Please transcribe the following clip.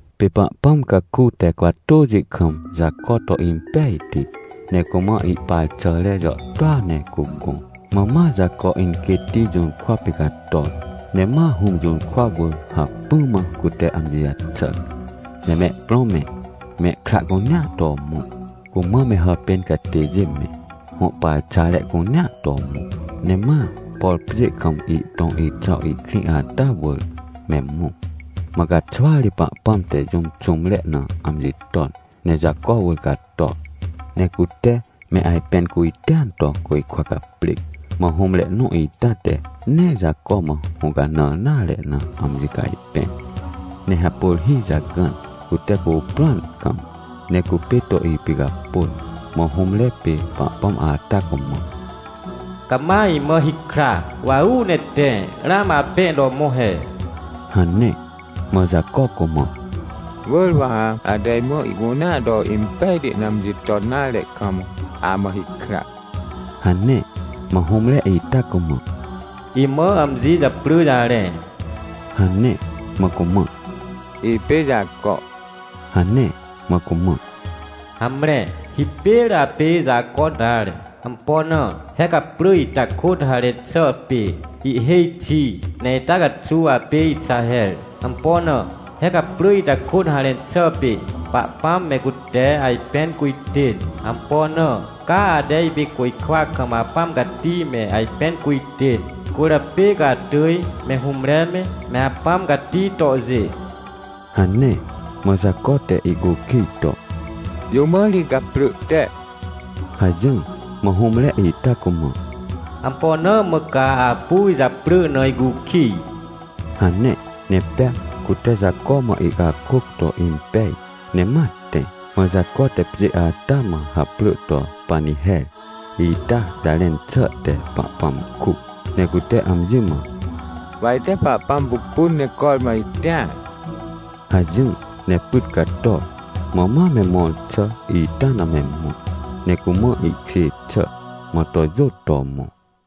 Pê Pahpãm caku te cwatôxi kam Jaco to impejti, ne cumã ihparxare jàhtôa ne cugõ. Mã ma Jaco inquêtti jũrkwa pê cator, ne ma hũm jũrkwa wỳr hacpỹ mã cute amji jaxàr. Ne mehprõ me, mehkra cunea to mõ, cumã me hàpên catêjê me, hõ parxare cunea to mõ. Ne ma, por pjê kam ihtõ Exaw ihkrĩ ata wỳr me mõ. Mã caxwa ri Pahpãm te jũm xũmre na amji ton ne Jaco wỳr cator, ne cute me ajpẽn cujtêan to côjkwa caprêc. Mã hũmre nõ ita te nee Jaco mã hũcanãr nare na amji cajpẽr, ne hapôr hi jagãn, cute cuprõan kam, ne cupê to ipicapôn. Mã hũmre pê Pahpãm ata cumã: — Cama imã hikra, wa uu ne tẽ, ramã apẽ to mõ he — hane. Mã Jaco cumã: — Wỳr wa ha, ate imã ihcunea to impejti na amji ton nare kam, amã hikra — hane. Mã hũmre ita cumã: — Imã amji japrỳ jarẽ — hane. Mã cumã: — Ipê Jaco — hane. Mã cumã: — Hamre, hipêr apê Jaco nare. Ampo na? He gaprỳ ita kôt harẽn xà pê “Ihhêj xi”. Ne ita caxuw apê Ixaher. Ampo na? He gaprỳ ita kôt harẽn xà pê “Pahpãm me cute ajpẽn cujtên”. Ampo na? Ca ate ipê côjkwa kam Apãm Cati me ajpẽn cujtên, cwỳrjapê ca atỳj, me hũmre me, me Apãm Cati tohjê — hane. Mã Jaco te ihcukij to: — Jũ mã ri gaprỳ te? — hajỹr. Mã hũmre ita cumã: — Ampo na mã ca apu ijaprỳ na icukij? — hane. Ne pea cute Jaco mã ihcakôc to impej, ne ma tẽ. Mã Jaco te pjê ata mã haprỳ to Paniher, ita jarẽn xà te “Pahpãm kuc”. Ne cute amji mã: — Wa ite Pahpãm pupun ne cormã itĩar — hajỹr. Ne pyt cator, mã ma me mõr xà ita na me mõ. Ne cumã ihkjê xà, mã to jôt to mõ.